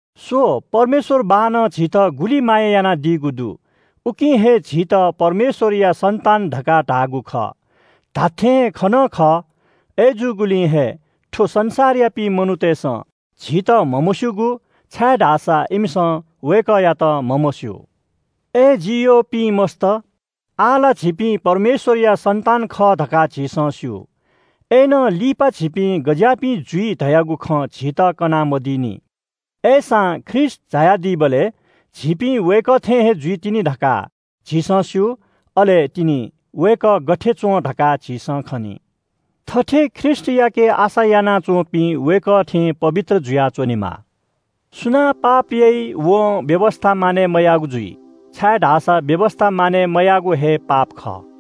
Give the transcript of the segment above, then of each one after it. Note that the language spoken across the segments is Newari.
स्‍व, परमेश्‍वर बाःनं झीत गुलि माया यानादीगु दु। उकिं हे झीत परमेश्‍वरया सन्‍तान धकाः धाःगु खः, धात्‍थें खः नं खः। अय्‌जूगुलिं हे थ्‍व संसारयापिं मनूतय्‌सं झीत म्‍हमस्‍यूगु, छाय्‌धाःसा इमिसं वय्‌कःयात म्‍हमस्‍यू। अय् जि यःपिं मस्‍त, आः ला झीपिं परमेश्‍वरया सन्‍तान खः धकाः झीसं स्‍यू। अय्‌नं लिपा झीपिं गज्‍याःपिं जुइ धयागु खँ झीत कना मदीनि। अय्‌सां ख्रीष्‍ट झायादीबलय् झीपिं वय्‌कः थें हे जुइतिनि धकाः झीसं स्‍यू। अले तिनि वय्‌कः गथे च्‍वं धकाः झीसं खनी। थथे ख्रीष्‍टयाके आशा यानाच्‍वंपिं वय्‌कः थें पवित्र जुयाः च्‍वनेमाः। सुनां पाप याइ वं व्‍यवस्‍था मानय् मयाःगु जुइ, छाय्‌धाःसा व्‍यवस्‍था मानय् मयायेगु हे पाप खः।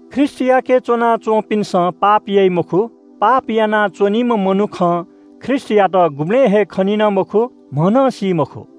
ख्रीष्‍टयाके च्‍वनाच्‍वंपिन्‍सं पाप याइ मखु। पाप यानाच्‍वनीम्‍ह मनुखं ख्रीष्‍टयात गुबलें हे खनी नं मखु, म्‍ह नं सी मखु।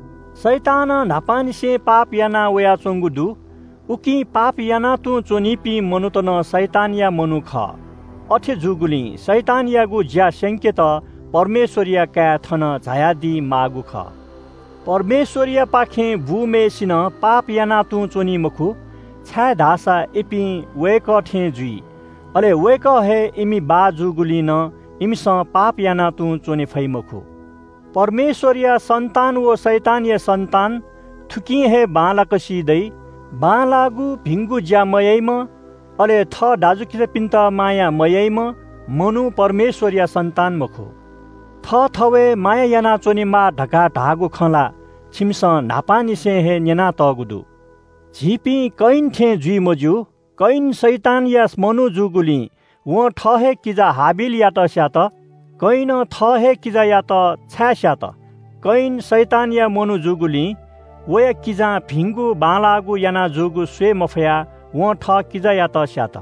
शैतानं न्‍हापांनिसें पाप याना वयाच्‍वंगु दु, उकिं पाप यानां तुं च्‍वनीपिं मनूत नं शैतानया मनू खः। अथे जूगुलिं शैतानयागु ज्‍या स्‍यंकेत परमेश्‍वरया काय् थन झायादी माःगु खः। परमेश्‍वरयापाखें बूम्‍हय्‌सिनं पाप यानां तुं च्‍वनी मखु, छाय्‌धाःसा इपिं वय्‌कः थें जुइ। अले वय्‌कः हे इमि बाः जूगुलिं नं इमिसं पाप यानां तुं च्‍वने फइ मखु। परमेश्‍वरया सन्‍तान व शैतानया सन्‍तान थुकिं हे बांलाक सी दइ। बांलाःगु भिंगु ज्‍या मयाइम्‍ह, अले थः दाजुकिजापिन्‍त माया मयाइम्‍ह मनू परमेश्‍वरया सन्‍तान मखु। थःथवय् माया यानाच्‍वनेमाः धकाः धाःगु खँ ला छिमिसं न्‍हापांनिसें हे न्‍यनातःगु दु। झीपिं कयिन थें जुइ मज्‍यू। कयिन शैतानया मनू जूगुलिं वं थः हे किजा हाबिलयात स्‍यात। कयिनं थः हे किजायात छाय् स्‍यात? कयिन शैतानया मनू जूगुलिं वया किजां भिंगु बांलाःगु याना जूगु स्‍वये मफयाः वं थः किजायात स्‍यात।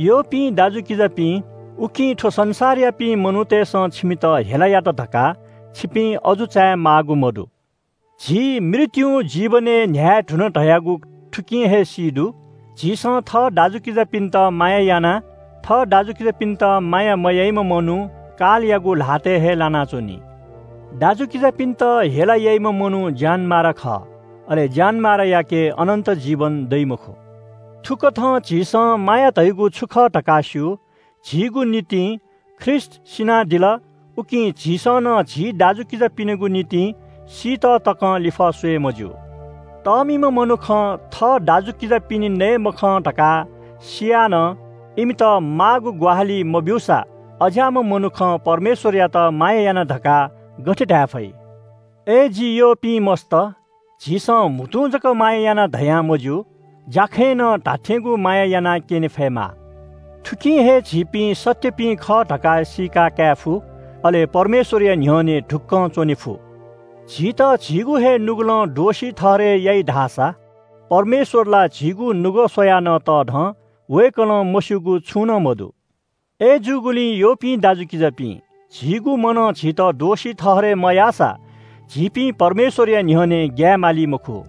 यःपिं दाजुकिजापिं, उकिं थ्‍व संसारयापिं मनूतय्‌सं छिमित हेला यात धकाः छिपिं अजू चायेमाःगु मदु। झी मृत्‍युं जीवनय् न्‍ह्याये धुन धयागु थुकिं हे सी दु। झीसं थः दाजुकिजापिन्‍त माया याना। थः दाजुकिजापिन्‍त माया मयाइम्‍ह मनू कालयागु ल्‍हातय् हे लानाच्‍वनी। दाजुकिजापिन्‍त हेला याइम्‍ह मनू ज्‍यानमारा खः। अले ज्‍यानमारायाके अनन्‍त जीवन दइ मखु। थुकथं झीसं माया धयागु छु खः धकाः स्‍यू – झीगु निंतिं ख्रीष्‍ट सिनादिल, उकिं झीसं नं झी दाजुकिजापिनिगु निंतिं सीत तकं लिफः स्‍वये मज्‍यू। तःमिम्‍ह मनुखं थः दाजुकिजापिनि नये मखं धकाः सियाः नं इमित माःगु ग्‍वाहालि मब्‍यूसा, अज्‍याःम्‍ह मनुखं परमेश्‍वरयात माया याना धकाः गथे धाये फइ? अय् जि यःपिं मस्‍त, झीसं म्‍हुतुं जक माया याना धयां मज्‍यू। ज्‍याखँय् नं धात्‍थेंगु माया यानाक्‍यने फयेमाः। थुकिं हे झीपिं सत्‍यपिं खः धकाः सीका धायेफु। अले परमेश्‍वरया न्‍ह्यःने ढुक्‍कं च्‍वने फु। झीत झीगु हे नुगलं दोषी ठहरय् याइ धाःसा परमेश्‍वर ला झीगु नुगः स्‍वयाः नं तःधं। वय्‌कलं मस्‍यूगु छुं नं मदु। अय्‌जूगुलिं यःपिं दाजुकिजापिं, झीगु मनं झीत दोषी ठहरय् मयाःसा झीपिं परमेश्‍वरया न्‍ह्यःने ग्‍याये माली मखु।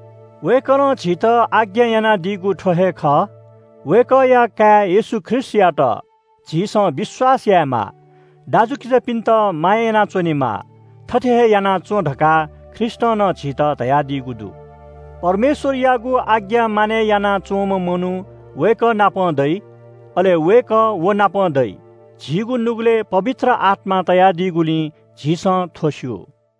वय्‌कलं झीत आज्ञा यानादीगु थ्‍व हे खः – वय्‌कःया काय् येशू ख्रीष्‍टयात झीसं विश्‍वास यायेमाः। दाजुकिजापिन्‍त माया यानाच्‍वनेमाः। थथे हे याना च्‍वँ धकाः ख्रीष्‍टं नं झीत धयादीगु दु। परमेश्‍वरयागु आज्ञा मानय् यानाच्‍वंम्‍ह मनू वय्‌कः नाप दइ, अले वय्‌कः व नाप दइ। झीगु नुगलय् पवित्र आत्‍मा तयादीगुलिं झीसं थ्‍व स्‍यू।